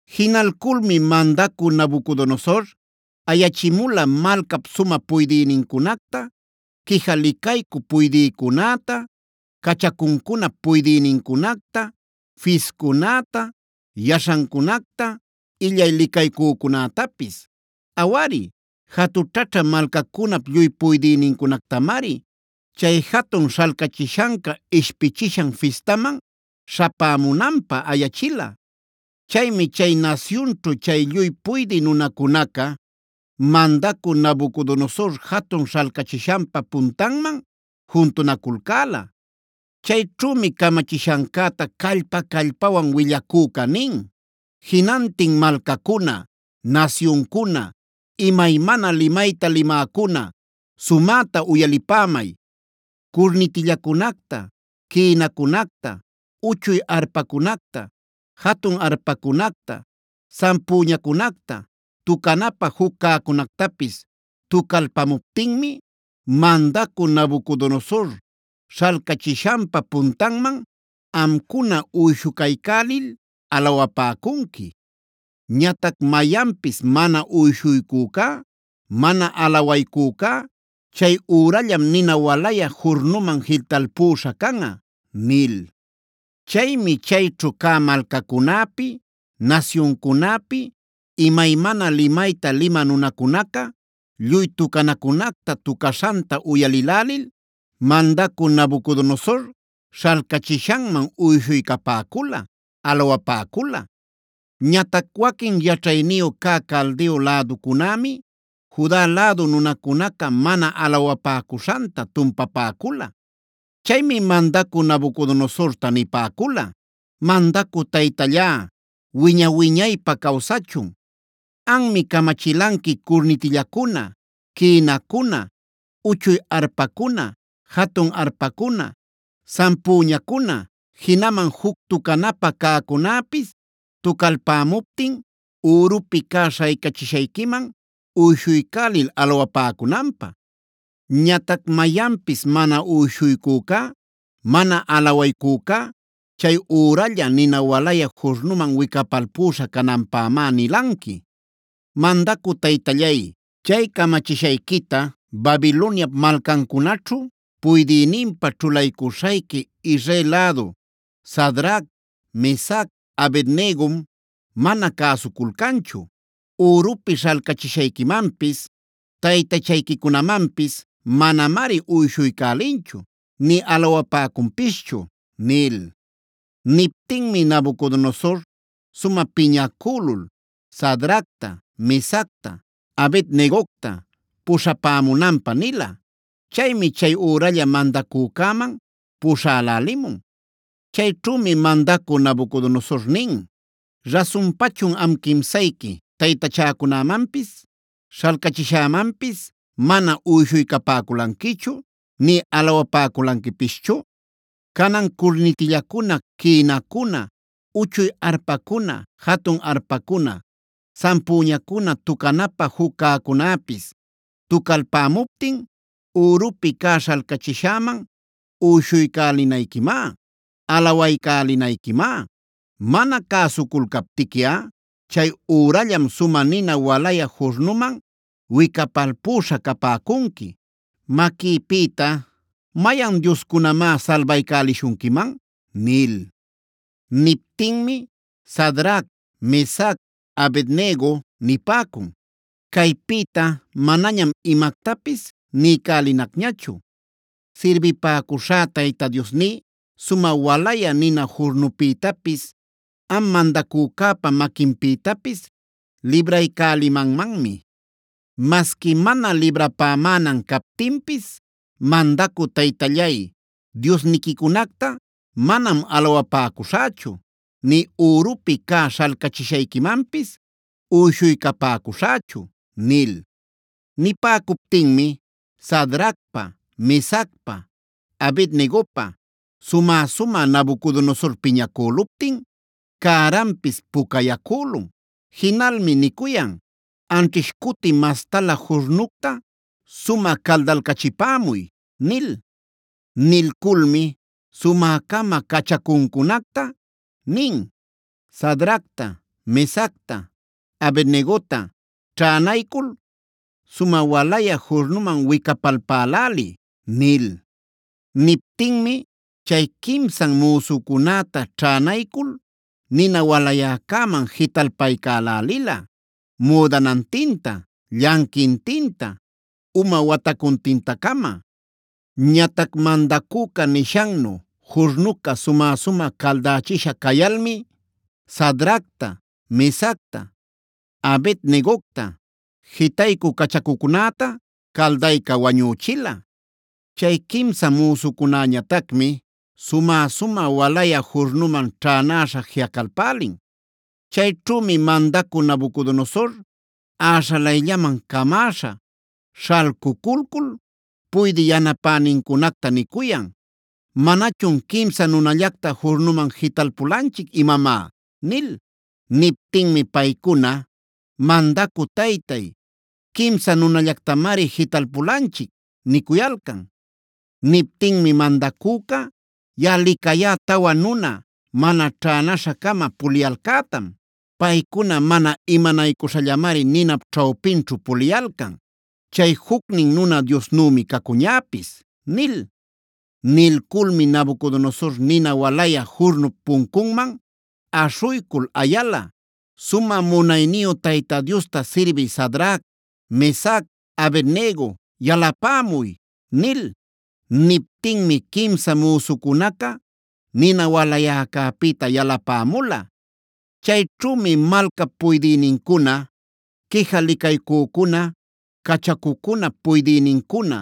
Jinalculmi mandacü Nabucodonosor ayachimula malcap sumä puydïnincunacta, quija licaycü puydïcunäta, cachacuncunap puydïnincunacta, fiscunäta, yaśhancunacta, illay licaycücunätapis; awari jatućhaćha malcacunap lluy puydïnincunactamari chay jatun śhalcachishanca ishpichishan fistaman śhapämunanpä ayachila. Chaymi chay nasyunćhu chay lluy puydï nunacunaca mandacü Nabucodonosor jatun śhalcachishanpa puntanman juntunaculcäla. Chayćhümi camachishancäta callpa-callpawan willacüca nin: “Jinantin malcacuna, nasyuncuna, imaymana limayta limäcuna sumäta uyalipämay. Curnitillacunacta, quïnacunacta, uchuy arpacunacta, jatun arpacunacta, sampüñacunacta, tucanapä juc cäcunactapis tucalpamuptinmi mandacü Nabucodonosor śhalcachishanpa puntanman amcuna uyshucaycälil alawapäcunqui. Ñatac mayanpis mana uyshuycücá, mana alawaycücá, chay ürallam nina walayä jurnuman jitalpüśha canꞌa” nil. Chaymi chayćhu cä malcacunäpi, nasyuncunäpi, imaymana limayta limä nunacunaca lluy tucanacunacta tucaśhanta uyalïlälil mandacü Nabucodonosor śhalcachishanman uyshuycapäcula, alawapäcula. Ñatac waquin yaćhayniyu cä Caldeo läducunämi Juda lädu nunacunaca mana alawapäcuśhanta tumpapäcula. Chaymi mandacü Nabucodonosorta nipäcula: “¡Mandacü taytallá, wiña-wiñaypä cawsachun! Anmi camachilanqui curnitillacuna, quïnacuna, uchuy arpacuna, jatun arpacuna, sampüñacuna, jinaman juc tucanapä cäcunäpis tucalpämuptin ürupi cä śhaycachishayquiman uyshuycälil alawapäcunanpä. Ñatac mayanpis mana uyshuycücá, mana alawaycücá, chay üralla nina walayä jurnuman wicapalpüśha cananpämá nilanqui. Mandacü taytallay, chay camachishayquita Babiloniap malcancunaćhu puydïninpa ćhulaycuśhayqui Israel lädu Sadrac, Mesac, Abed-negom mana cäsuculcanchu. Ürupi śhalcachishayquimanpis, taytachayquicunamanpis manamari uyshuycälinchu nï alawapäcunpischu” nil. Niptinmi Nabucodonosor sumä piñacülul Sadracta, Mesacta, Abed-negocta puśhapämunanpä nila. Chaymi chay üralla mandacücäman puśhälälimun. Chayćhümi mandacü Nabucodonosor nin: “¿Rasunpachun am quimsayqui, taytachäcunamanpis, śhalcachishämanpis mana uyshuycapäculanquichu nï alawapäculanquipischu? Canan, curnitillacuna, quïnacuna, uchuy arpacuna, jatun arpacuna, sampüñacuna, tucanapä juc cäcunäpis tucalpämuptin ürupi cä śhalcachishäman uyshuycälinayquimá, alawaycälinayquimá. Mana cäsuculcaptiquiꞌa chay ürallam sumä nina walayä jurnuman wicapalpüśha capäcunqui. Maquïpïta, ¿mayan dioscunamá salbaycälishunquiman?” nil. Niptinmi Sadrac, Mesac, Abed-nego nipäcun: “Caypïta manañam imactapis niycälinacñachu. Sirbipäcuśhá Tayta Diosní, sumä walayä nina jurnupïtapis, am mandacücäpa maquinpïtapis libraycälimanmanmi. Masqui mana librapämänan captinpis mandacü taytallay, diosniquicunacta manam alawapäcuśhächu, nï ürupi cä śhalcachishayquimanpis uyshuycapäcuśhächu” nil. Nipäcuptinmi Sadracpa, Mesacpa, Abed-negopa sumä-sumä Nabucodonosor piñacüluptin cäranpis pucayacülun. Jinalmi nicuyan: “Anćhish cuti mastalä jurnucta sumä caldalcachipämuy” nil. Nilculmi sumä-cama cachacuncunacta nin: “Sadracta, Mesacta, Abed-negota ćhänaycul sumä walayä jurnuman wicapalpäläliy” nil. Niptinmi chay quimsan müsucunäta ćhänaycul nina walayäcäman jitalpaycälälila müdanantinta, llanquintinta, uma watacuntinta-cama. Ñatac mandacüca nishannu jurnuca sumä-sumä caldächisha cayalmi Sadracta, Mesacta, Abed-negocta, jitaycü cachacucunäta caldayca wañüchila. Chay quimsa müsucunäñatacmi sumä-sumä walayä jurnuman ćhänäśha jiꞌacalpälin. Chayćhümi mandacü Nabucodonosor äśhalayllaman camäśha, śhalcuculcul puydï yanapänincunacta nicuyan: “¿Manachun quimsa nunallacta jurnuman jitalpulanchic imamá?” nil. Niptinmi paycuna: “Mandacü taytay, quimsa nunallactamari jitalpulanchic” nicuyalcan. Niptinmi mandacüca: “Yaꞌa licayá tawa nuna mana ćhänäśha-cama puliyalcätam. Paycuna mana imanaycuśhallamari ninap ćhawpinćhu puliyalcan. Chay jucnin nuna diosnümi cacuñäpis” nil. Nilculmi Nabucodonosor nina walayä jurnup puncunman aśhuycul ayala: “Sumä munayniyu Tayta Diosta sirbï Sadrac, Mesac, Abed-nego yalapämuy” nil. Niptinmi quimsa müsucunaca nina walayäcäpïta yalapämula. Chayćhümi malcap puydïnincuna, quija licaycücuna, cachacucunap puydïnincuna,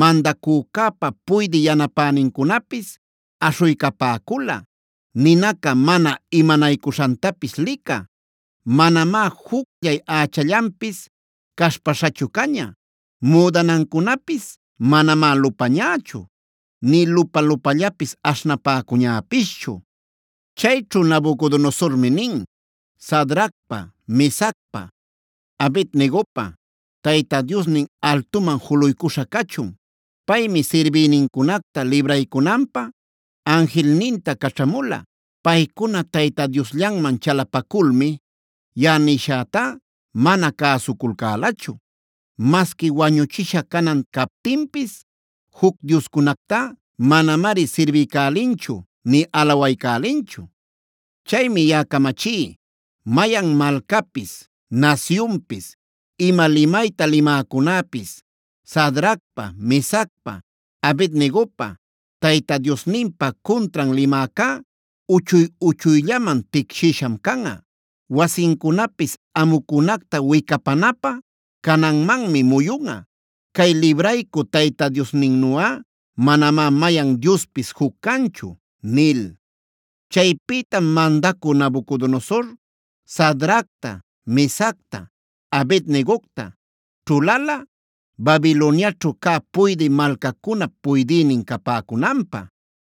mandacücäpa puydï yanapänincunapis aśhuycapäcula ninaca mana imanaycuśhantapis licä. Manamá jucllay ächallanpis cashpaśhachu caña. Müdanancunapis manamá lupañächu, nï lupa-lupallapis aśhnapäcuñäpischu. Chayćhu Nabucodonosormi nin: “Sadracpa, Mesacpa, Abed-negopa Tayta Diosnin altuman juluycuśha cachun. Paymi sirbïnincunacta libraycunanpä anjilninta caćhamula. Paycuna Tayta Diosllanman chalapaculmi yaꞌa nishätá mana cäsuculcälachu. Masqui wañuchisha canan captinpis juc dioscunactá manamari sirbiycälinchu nï alawaycälinchu. Chaymi yaꞌa camachí: Mayan malcapis, nasyunpis, ima limayta limäcunäpis Sadracpa, Mesacpa, Abed-negopa Tayta Diosninpa cuntran limäcá uchuy-uchuyllaman ticshïsham canꞌa. Wasincunapis amucunacta wicapanapä cananmanmi muyunꞌa. Cay libraycü Tayta Diosninnuꞌa manamá mayan diospis juc canchu” nil. Chaypïtam mandacü Nabucodonosor Sadracta, Mesacta, Abed-negocta ćhulala Babiloniaćhu cä puydï malcacunap puydïnin capäcunanpä.